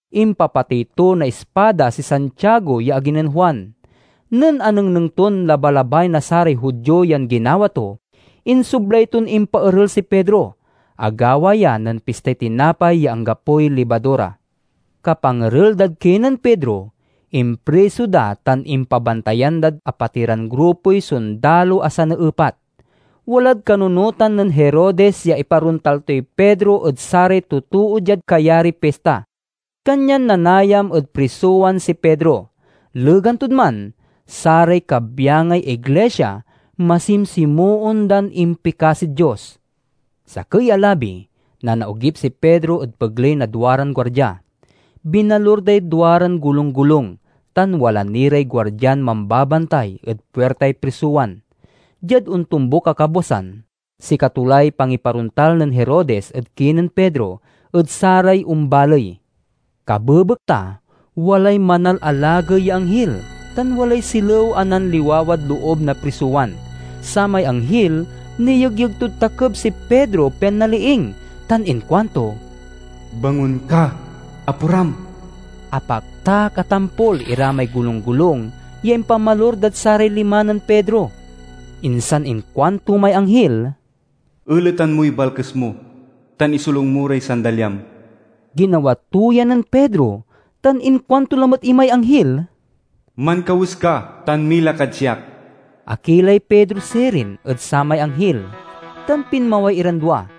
Impapatey to na ispada si Santiago ya agi nen Juan. Nen anengneng ton labalabay na saray Judio yan ginawa to, insoblay ton impaerel si Pedro. (Agawa ya nen Pistay Tinapay ya Anggapoy Libadura.) Kapangerel dad kinen Pedro, impriso da tan impabantayan dad apatiran grupoy sondalo a saneepat. Walad kanunotan nen Herodes ya iparontal toy Pedro ed saray totoo diad kayariy pista. Kanyan nanayam ed prisowan si Pedro. Legan tod man, saray kabyangay iglisia masimsimoon dan impikasid Dios. Sakey a labi, nanaogip si Pedro ed pegley na duaran guardia. Binalur day duaran golunggolung, tan wala ni ray guardian mambabantay ed puirtay prisowan. Diad ontombuk a kabwasan, sikato lay pangiparontal nen Herodes ed kinen Pedro ed saray ombaley. Kabebekta walay manalalagey ya anghil, tan walay silew a nanliwawad loob na prisowan. Samay anghil niyegyeg tod takeb si Pedro pian naliing, tan inkuanto, "Bangon ka! Aporam!" Apaktak a tampol ira may golunggolung ya impamalur dad saray lima nen Pedro. Insan inkuanto may anghil, "Eletan moy balkes mo, tan isolung mo ray sandalyam." Ginawa to ya nen Pedro, tan inkuanto lamet imay anghil, "Mankawes ka, tan mila kad siak." Akilay Pedro sirin ed samay anghil, tan pinmaway iran dua.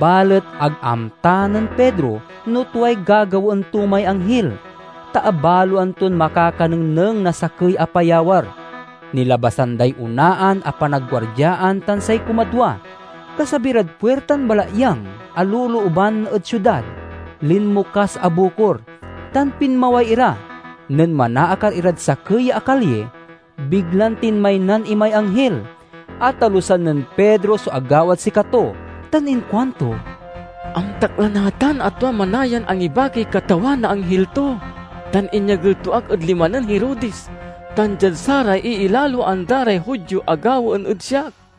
Balet ag amta nen Pedro no tuay gagawaen to may anghil, ta abaloan ton makakanengneng na sakey a payawar. Nilabasan day onaan a panagguardiaan tan say kumadwa. Kasabi rad puirtan balatyang a lolooban ed siudad, linmokas a bukor, tan pinmaway ira. Nen manaakar irad sakey a kalyi, biglan tinmaynan imay anghil. Atalusan nen Pedro so agawad sikato tan inkuanto, "Amtak la natan a tua manayan angibakiy Katawan na anghil to, tan inyagel to ak ed lima nen Herodes tan diad saray iilaloan da ray Judio a gawaen ed siak."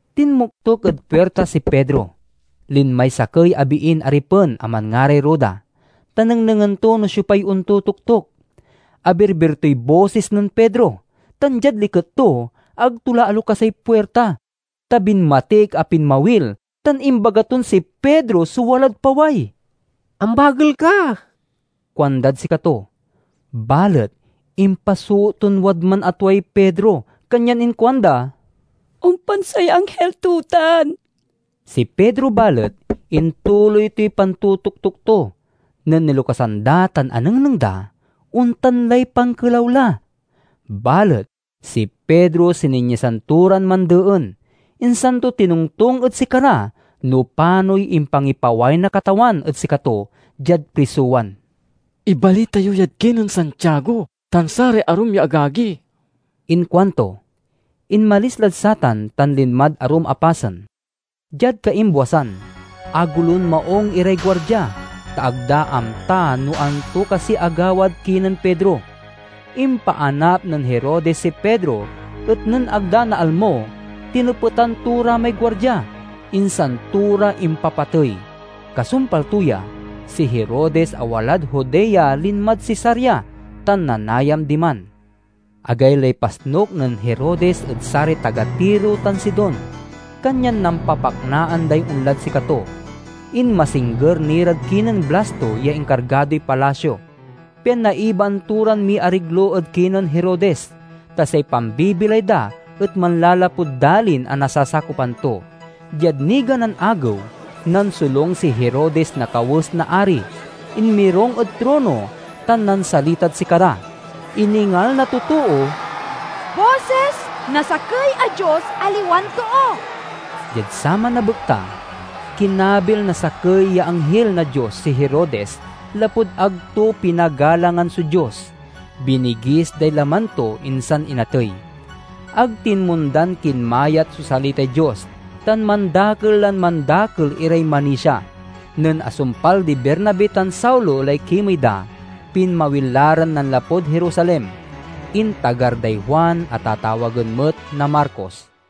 Tinmoktok ed puirta si Pedro. Linmay sakey a biin aripen a manngaray Roda, ta nengnengen to no siopay ontotoktok. Abirbir toy bosis nen Pedro tan, diad liket to, ag to la alokasay puirta, ta binmatik a pinmawil tan imbaga ton si Pedro so walad paway. "Ambagel ke!" kuandad sikato. Balet impasoot ton wadman a tuay Pedro kanyan inkuanda, "Ompan say anghil to tan!" Si Pedro, balet, intuloy toy pantotoktok to. Nen nilokasan da tan anengneng da, ontan lay pankelaw la. Balet si Pedro sininyasan to ran mandeen, insan to tinongtong ed sikara no panoy impangipaway na Katawan ed sikato diad prisowan. "Ibalita yo yad kinen Santiago tan saray arum ya agagi," inkuanto. Inmalis lad satan, tan linmad arum a pasen. Diad kaimbwasan, agolon maung iray guardia, ta ag da amta no anto kasiy agawad kinen Pedro. Impaanap nen Herodes si Pedro, et nen ag da naalmo, tinepetan to ra may guardia, insan to ra impapatey. Kasumpal to ya, si Herodes a walad Judea linmad Cesarea, tan nanayam diman. Agaylay pasnuk nen Herodes ed saray taga Tiro tan Sidon, kanyan nampapaknaan day onlad sikato. Inmasingger ni rad kinen Blasto ya inkargadoy palasio, pian naibaan to ran miariglo ed kinen Herodes, ta say pambibilay da et manlalapud dalin a nasasakopan to. Diad niganan agew, nansolung si Herodes na kawes na ari, inmirung ed trono, tan nansalitad sikara. Iningal na totoo, "Bosis na sakey a dios, aliwan too!" Diad saman a bekta, kinabil na sakey ya anghil na Dios si Herodes lapud ag to pinagalangan so Dios. Binigis day laman to, insan inatey. Ag tinmondan kinmayat so salitay Dios, tan mandakel lan mandakel iray manisia. Nen asumpal di Bernabe tan Saulo lay kimey da, pinmawil la ran nanlapud Jerusalem. Intagar day Juan a tatawagen met na Marcos.